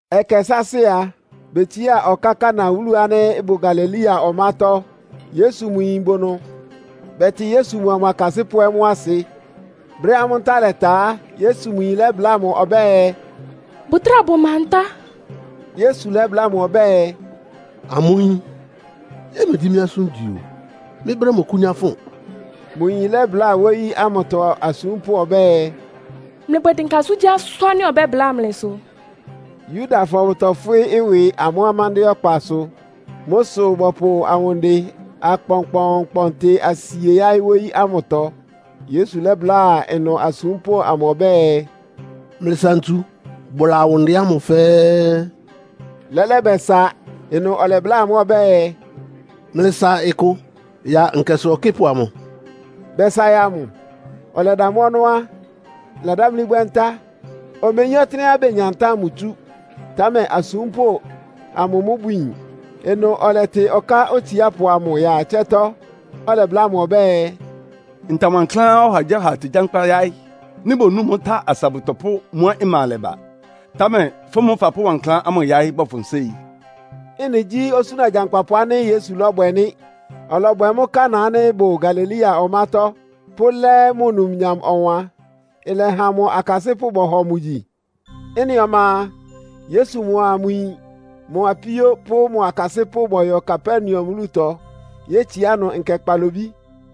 Ɛkɛ sáásɩ́ a, betsiá ɔká Kana wúlu ánɩ́ ɩbʋ Galilea ɔmátɔ́. Yesu mʋ yin bʋ ɩnʋ. Bɛtɩ Yesu mʋa mʋ akasɩ́pʋ́ ɛ́ mʋ́ asɩ. Brɛ́á amʋ́ ntá lɛta á, Yesu mʋ yin lɛ́bláa mʋ ɔbɛ́ɛ, “Bʋtráa bʋma ntá.” Yesu lɛ́bláa mʋ ɔbɛ́ɛ, “Amʋ́ yín, yɛ́ɛ megyí mɩ́ asʋ́n igyi o! Mɩ́ brɛ́ mɔkʋ́nyá fʋn.” Mʋ yin lɛ́bláa wóyí ámʋtɔ asúmpʋ́ ɔbɛ́ɛ, “Mlɩbwɛ dɩnka asʋ́ngyíasʋ́n ánɩ́ ɔbɛ́bláa mlɩsʋ.” Yudafɔ bʋtɔfwɩ́ ɩwɩ amʋ́ amándɩ́ɛ́ ɔkpasʋ. Mʋ́ sʋ bɔpʋ awʋndɩ akpɔnkpɔɔnkpɔntɩ asie yáɩ́ wóyí ámʋtɔ. Yesu lɛ́bláa ɩnʋ asúmpʋ́ amʋ ɔbɛ́ɛ, “Mlɩsa ntsu bʋla awʋndɩ ámʋ fɛ́ɛ́.” Lɛ́lɛ́ bɛsa. Ɩnʋ ɔlɛbláa amʋ́ ɔbɛ́ɛ, “Mlɩsa ɩkʋ ya nkɛsʋ ɔkɩ́pʋ amʋ.” Bɛsa ya mʋ. Ɔlɛda mʋ́ ɔnɔ́ á, ɩladámlí bwɛ́ ntá. Omeyín ɔtɩ́nɛ́á benya ntá ámʋ tsú. (Támɛ asúmpʋ́ amʋ mʋ́ bʋyin.) Ɩnʋ ɔlɛtɩ ɔká otsiápʋ amʋ ya ɩtsɛ́tɔ́, ɔlɛbláa mʋ ɔbɛ́ɛ, “Nta wankláán ɔhagyíɔha tegyankpá yáɩ́. Nɩ́ bonu mʋ́ tá asa bʋtɔpʋ́ mʋ́á ɩma alɛ ba. Támɛ fʋ́ mʋ́ fapʋ́ wankláán ámʋ yáɩ́ bɔfʋn séi.” Ɩ́nɩ gyí osúna gyankpapʋ ánɩ́ Yesu lɔ́bwɛ nɩ́. Ɔlɔbwɛ mʋ́ Kana ánɩ́ ɩbʋ Galilea ɔmátɔ́, pʋ́lɛ́ mʋ numnyam ɔwan. Ɩlɛha mʋ akasɩ́pʋ́ bɔhɔ mʋ gyi. Ɩ́nɩ ɔma a, Yesu mʋa mʋ yin, mʋ apíó pʋ́ mʋ akasɩ́pʋ́ bɔyɔ Kapernaum wúlutɔ, yétsiá ɩnʋ nkɛ kpalobí.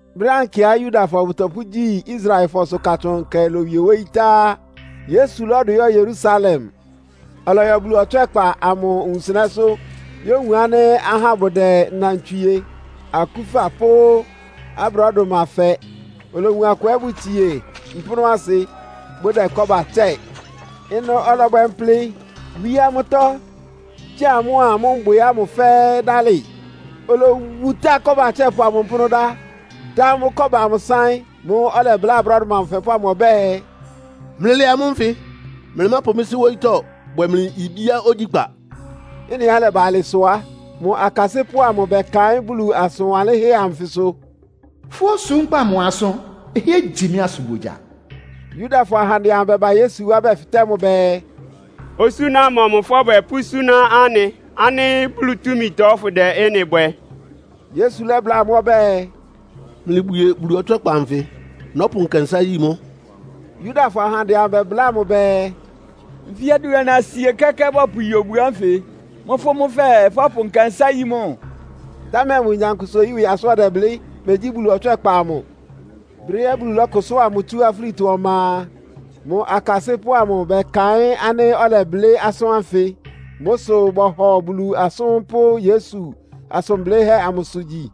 Brɛ́á nkɛá Yudafɔ bɔ́pʋgyi Israelfɔsʋ Katsʋn Nkɛ lowie wóyí tá á, Yesu lɔ́dʋ yɔ́ Yerusalem. Ɔlɔyɔ Bulu ɔtswɛ́kpa amʋ wunsɩnɛ́sʋ́ yówun ánɩ́ ahá bʋdɛ nnantswie, akúfa pʋ́ abrɔ́dʋma fɛ. Olowun akʋ ɛ́ bʋtsie mpʋ́nʋ́asɩ bʋdɛ kɔ́ba tsɛ́ɛ. Ɩnʋ ɔlɔbwɛ mplɩ, wíé amʋ́tɔ́, gyáa amʋ́a mbwɩ ámʋ fɛ́ɛ́ dálɩ. Olowutá kɔ́ba atsɛ́pʋ amʋ mpʋ́nʋ́ dá, dá amʋ́ kɔ́ba sáɩ́n. Mʋ́ʋ́ ɔlɛbláa abrɔ́dʋma afɛpʋ́ ámʋ ɔbɛ́ɛ, “Mlɩlɛ amʋ́ nfɩ! Mlɩmápʋ mɩ́ Sɩ́ wóyítɔ́ bwɛ́ mlɩ ibíá ogyíkpá.” Ɩ́nɩá ɩlɛba alɩ sʋ á, mʋ akasɩ́pʋ́ amʋ bɛkaɩ́n Bulu asʋn wanlɩ́nhɛ́ anfɩsʋ. “Fʋ́ osúmkpá amʋ asʋ́n ɩhɩ́ɛ́ igyi mɩ́ asʋnbogya.” Yudafɔ ahandɛ amʋ bɛba Yesu wá bɛfɩtɛ́ mʋ bɛɛ, “Osúna mɔmʋ fɔ́bwɛ pʋ́súná anɩ ánɩ́ Bulu túmitɔ fʋ́dɛ ɩ́nɩ bwɛ?” Yesu lɛ́bláa amʋ́ ɔbɛ́ɛ, “Mlɩbwie Bulu ɔtswɛ́kpa anfɩ, nɔ́pʋ nkɛnsá yí mʋ́.” Yudafɔ ahandɛ amʋ bɛbláa mʋ bɛɛ, “Nfí adʋana-sie kɛ́kɛ́ bɔpʋyi obu ánfɩ. Mʋ́ fʋ́ mʋ́ fɛɛ, fɔ́pʋ nkɛnsá yí mʋ́?” Támɛ mʋ nyankpʋsa-oyí ɩwɩ asʋ́n ɔdɛblɩ́, megyí Bulu ɔtswɛ́kpa amʋ. Brɛ́á Bulu lɔ́kʋsʋ́a mʋ tsú afúlitɔ ɔma a, mʋ akasɩ́pʋ́ amʋ bɛkaɩ́n ánɩ́ ɔlɛblɩ́ asʋ́n ánfɩ. Mʋ́ sʋ bɔhɔ Bulu asʋ́n pʋ́ Yesu asʋn blɩ́hɛ́ amʋsʋ gyi.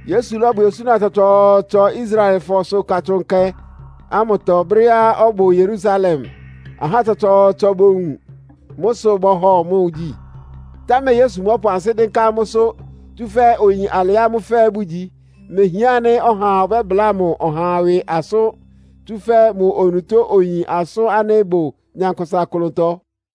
Yesu lɔ́bwɛ osúna tsɔtsɔɔtsɔ Israelfɔsʋ Katsʋn Nkɛ ámʋtɔ brɛ́á ɔbʋ Yerusalem, ahá tsɔtsɔɔtsɔ bowun. Mʋ́ sʋ bɔhɔ mʋ gyi. Támɛ Yesu mɔ́pʋ ansɩ́ dɩ́nká amʋ́sʋ́, tsúfɛ́ oyin alɩá amʋ́ fɛ́ɛ́ bʋgyi. Mehián ánɩ́ ɔhaa ɔbɛ́bláa mʋ ɔha ɩwɩ asʋ́n, tsúfɛ́ mʋ onutó oyin asʋ́n ánɩ́ ɩbʋ nyankpʋsa klʋntɔ.